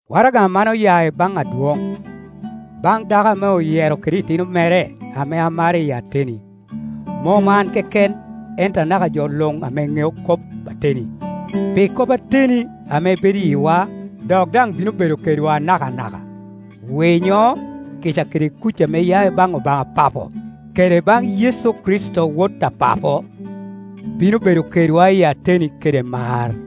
Waraga man oya i baŋ adwoŋ. Baŋ dako ame oyero kede itino mere ame amaro iyi ateni, mom an keken, ento anaka jo luŋ ame ŋeo kop ateni, pi kop ateni ame bedo i yiwa dok daŋ bino bedo kedwa nakanaka. Winyo, kica kede kuc ame ya i baŋ Obaŋa Papo, kede baŋ Yecu Kricito Wot a Papo, bino bedo kedwa i ateni kede mar.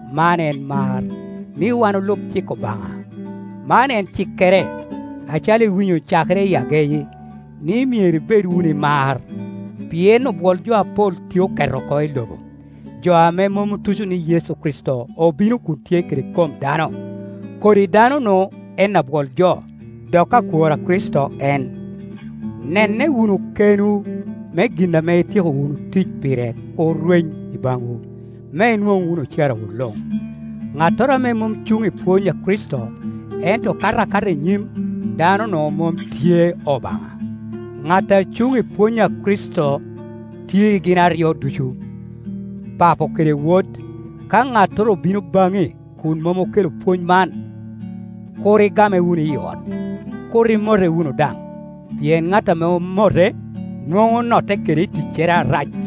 Man en mar, ni wan olub cik Obaŋa; man en cikkere, acalo iwinyo cakere i ageyi, ni myero ibed wunu i mar. Pien obwol jo apol tye oket oko i lobo, jo ame mom otuco ni Yecu Kricito obino kun tye kede kom dano, kodi dano-nu en abwol jo, dok akwor a Kricito en. Nenne wunu kenwu me gin ame ityeko wunu tic pire kur rweny i baŋwu, me inwoŋ wunu ocarawu luŋ. Ŋattoro ame mom cuŋ i pwony a Kricito ento kato akata i nyim, dano-nu mom tye Obaŋa; ŋat a cuŋ i pwony a Kricito, tye i gin aryo ducu, Papo kede Wod. Ka ŋattoro obino baŋi kun mom okelo pwony man, kur igame wunu i ot, kur imote wunu daŋ; pien ŋat ame omote, nwoŋo onotte kede i ticcere arac.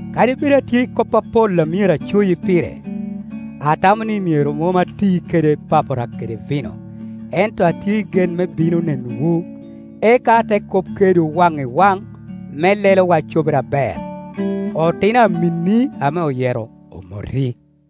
Kadi bed atye i kop apol a myero acoyi pire, atamo ni myero mom ati kede papara kede vino, ento atye i gen me a bino nenowu, eka ate kop kedwu waŋ i waŋ me lelowa cobere aber. Otino aminni ame oyero omoti.